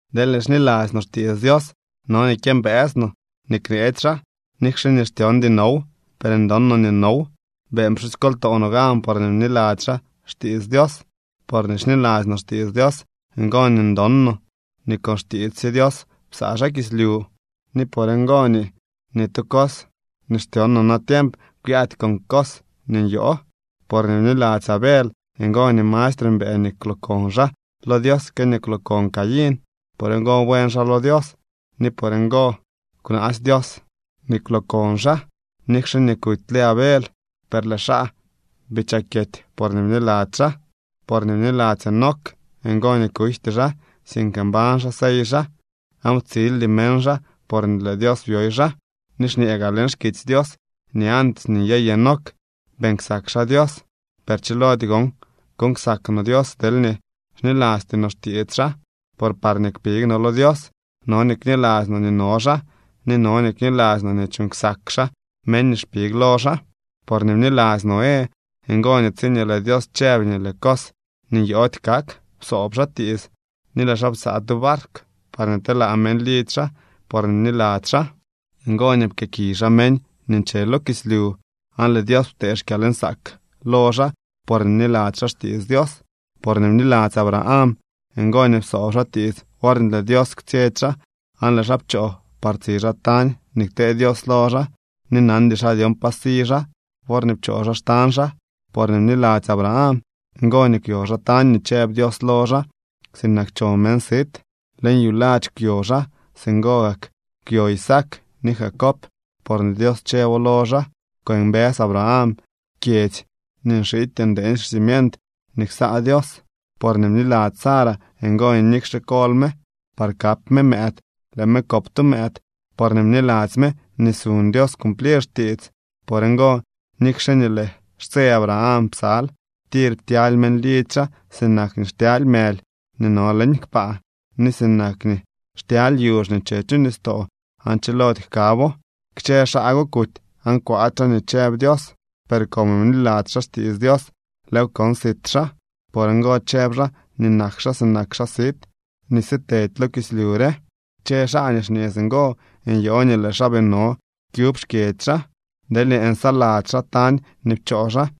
Deelñee xniladzy no xtiits Dios, no nii kyëmbëës no nii kneetsy xaa. Nikxe nii xtyondy now, per ndon no nii now. Beeñ pxusykoltoo no gan porñee bniladzy xaa xtiits Dios. Porñee xniladzy no xtiits Dios, ngo nii ndon no nii con xtiits sye Dios psaa xaa kislyu, ni por ngo nii ni tu cos nii xtyon no natiemp kwyaady con cos nii nyoo. Porñee bniladzy Abel, ngo nii mastre mbëë nii kwlookon xaa lo Dios que nii kwlookon Caín. Por ngo buen xaa lo Dios, ni por ngo kwnaasy Dios nii kwlookon xaa. Nikxe kutyle Abel, per lëë xaa bii chakyety, porñee bniladzy xaa. Porñee bniladzy Enoc, ngo nii kujty xaa, sink mbañ xaa sey xaa, aan ptsildy meñ xaa porñee lëë Dios byoy xaa. Ni xñee gaa leñ xkitsy Dios nii antes nii nyey Enoc, beeñ ksak xaa Dios. Per chilody gon kuuñ ksak no Dios deelñee xnilasty no xtiits xaa, por parñee kpig no lo Dios no nii kniladzy no nii no xaa ni no nii kniladzy no nii chuuñ ksak xaa meñ nii xpig lo xaa. Porñee bniladzy Noé, ngo nii tsiñee lëë Dios chëb nii lëë cos nii nyoody kak, psoob xaa tiits ni lëë xaa psaa tu barkw parñee telaa meñ lidzy xaa. Porñee bniladzy xaa, ngo nii pkëëkiy xaa meñ nii nche lo kislyu, aan lëë Dios ptee xkyalnsaak lo xaa porñee bniladzy xaa xtiits Dios. Porñee bniladzy Abraham, ngo nii psoob xaa tiits worñee lëë Dios kwtsyetsy xaa, aan lëë xaa pchoo par tsi xaa tañ nii ktee Dios lo xaa. Ni nandy xaa dyon pa si xaa worñee pchoo xaa xtañ xaa. Porñee bniladzy Abraham, ngo nii kwyo xaa tañ nii chëb Dios lo xaa sinak cho meñ sit. Leñ yuladx kwyo xaa. Singo gak kwyo Isaac ni Jacob porñee Dios chëbo lo xaa. Kwëmbës Abraham kyedzy nii nxity ndeeñ xcimient nii ksaa Dios. Porñee bniladzy Sara, ngo nii nikxe kol me par kap me mëëd, lëë me kop tu mëëd, porñee bniladzy me nii suñ Dios cumplir xtiits. Por ngo, nikxe nii lëë xtse Abraham psal, tir ptyaly meñ lidzy xaa sinak nii xtyaly mëly nii no leñ kpaa ni sinak nii xtyaly yuzh nii nche chu nistoo aan chilody jkabo. Kchë xaa go kuty aan kwaady xaa nii chëb Dios, per como bniladzy xaa xtiits Dios, lëëw kon sit xaa. Por ngo chëb xaa nii nak xaa sinak xaa sit nii sitedy lo kislyu re. Kchë xaa nii xñee singo nyoo nii lëë xaa bii no kyub xkyedzy xaa. Deelñee nsaladzy xaa tañ nii pchoo xaa,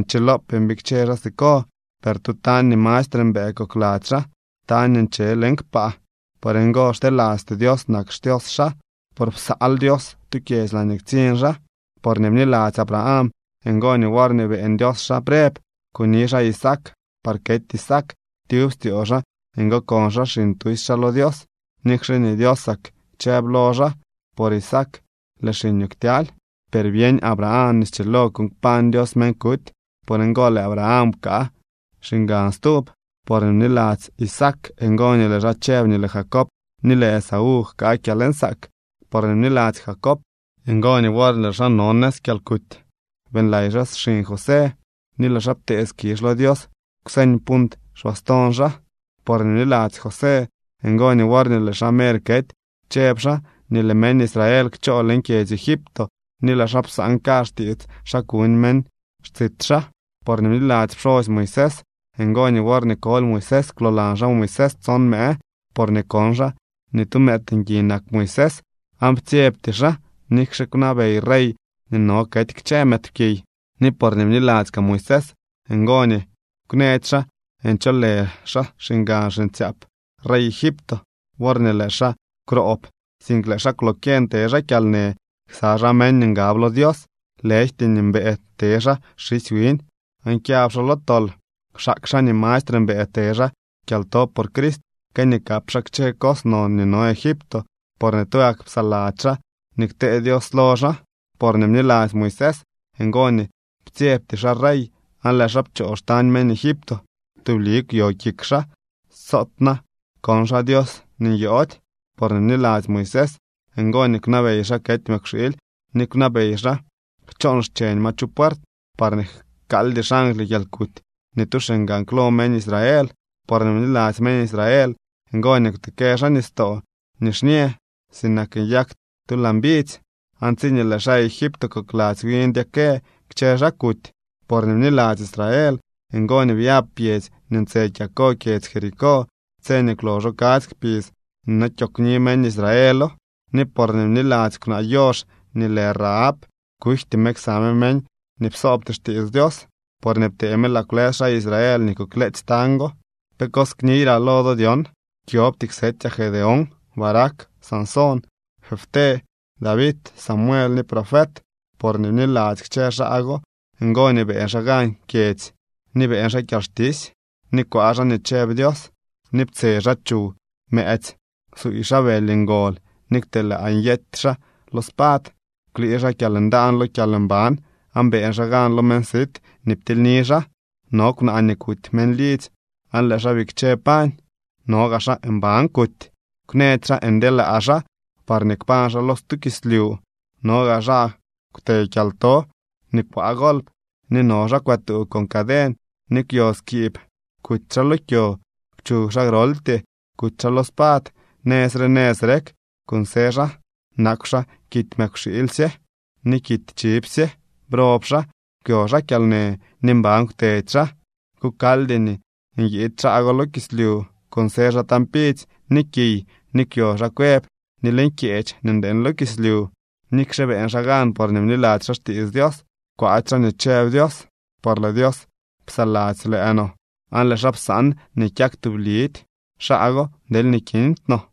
nchilopee mbikche xaa siko. Per tu tañ nii mastre mbëë kokladzy xaa, tañ nii nche leñ kpaa. Por ngo xtelasty Dios nak xDios xaa, por psaal Dios tu kyedzy laañee ktsiñ xaa. Porñee bniladzy Abraham, ngo nii worñee beeñ Dios xaa preb, kuni xaa Isaac par kety Isaac. Tyub styoo xaa ngookon xaa xiñ tusy xaa lo Dios, nikxe nii Diosak chëb lo xaa: “Por Isaac lëë xiñoo ktyaly.” Per byeñ Abraham nii schilo kuuñ kpañ Dios meñ kuty. Por ngo lëë Abraham pkaa xiñgan stub. Porñee bniladzy Isaac, ngo nii lëë xaa chëb nii lëë Jacob ni lëë Esaú jkaa kyalnsaak. Porñee bniladzy Jacob, ngo nii worñee lëë xaa no nëz kyalkuty, beeñlay xaa xiñ José, ni lëë xaa ptee skizh lo Dios kwseñ punt xbaston xaa. Porñee bniladzy José, ngo nii worñee lëë xaa mer kety chëb xaa nii lëë meñ Israel kchoo leñ kyedzy Egipto, ni lëë xaa psaan kazh tiits xa kuñ meñ xtsit xaa. Porñee bniladzy pxosy Moisés, ngo nii worñee koly Moisés kwloolan xaa Moisés tson mëë, porñee kon xaa nii tu mëëd ngui nak Moisés, aan ptsyebty xaa, nikxe kwnabey rey nii no kety kchë mëëdpkiy. Ni porñee bniladzy kaa Moisés, ngo nii kwnëdy xaa ncholë xaa xiñgan xiñtsyaap rey Egipto worñee lëë xaa kwroob, sink lëë xaa kwlokyeñ te xaa kyalnë ksa xaa meñ nii ngab lo Dios, lëjty nii mbëë te xaa xisy wiñ aan kyab xaa lo tol. Kwxaak xaa nii mastre mbëë te xaa kyalto por Crist, que nii kap xaa kchë cos non nii no Egipto, porñee tugak psaladzy xaa nii ktee Dios lo xaa. Porñee bniladzy Moisés, ngo nii ptsyebty xaa rey aan lëë xaa pchoo xtañ meñ Egipto. Tubli kwyo kik xaa, soot na kon xaa Dios nii nyoody. Porñee bniladzy Moisés, ngo nii kwnabey xaa kety mëkwxiily ni kwnabey xaa kchoon xcheñ ma chu puert, parñee jkaaldy xangly kyalkuty ni tu xiñgan klo meñ Israel. Porñee bniladzy meñ Israel, ngo nii kwtekë xaa Nistoo Nixñë sinak nyak tu laa mbidzy, aan tsiñee lëë xaa Egipto kokladzy wi ndyekë, kchë xaa kuty. Porñee bniladzy xaa Israel, ngo nii byab pyedzy nii ntse kyako kyedzy Jericó tse nii kwloxo kadzy kpidz nii no kyoogwni meñ Israelo. Ni porñee bniladzy kwnaa yox nii lë Rahab, kujty me ksa me meñ nii psoobty xtiits Dios, porñee ptee me laa kwlës xaa Israel nii kukleetsy tañ go. ¿Pe cos kniyraa lo do dyon? Kyobty ksetyaa Gedeón, Barac, Sansón, Jefté, David, Samuel, ni profet. Porñee bniladzy kchë xaa go, ngo nii beeñ xaa gan kyedzy, ni beeñ xaa kyalxtisy, ni kwaa xaa nii chëb Dios, ni ptse xaa chuw mëëtsy. Psuuy xaa bëly ngol, ni kwtelaa nyety xaa lo spad. Kwlii xaa kyalndaan lo kyalmban, aan beeñ xaa gan lo meñ sit nii ptilyni xaa. No kwnaa nii kuty meñ lidzy aan lëë xaa bikche pañ. No gaa xaa mban kuty. Kwnëdy xaa ndyelaa xaa parñee kpañ xaa lo stu kislyu. No gaa xaa kwte kyalto, ni kwaa golp, ni no xaa kwëtuu con caden, ni kwyo skiib. Kuty xaa lo kyo. Kwchug xaa groltyee. Kuty xaa lo spad. Nëz re nëz rek kunsë xaa nakw xaa kidy mëkwxiilysye ni kidy chivsye. Prob xaa, kwyo xaa kyalnë, ni mban kwtedy xaa. Kukaldy nii nyiid xaa go lo kislyu. Kunsë xaa tañ pidzy ni kiy, ni kwyo xaa cuev ni leñ kyeech nii ndeeñ lo kislyu. Nikxe beeñ xaa gan porñee bniladzy xaa xtiits Dios, kwaady xaa nii chëb Dios, por lëë Dios psaladzy lëë no, aan lëë xaa psaan nii kyak tublidy xaa go deelñee kindy no.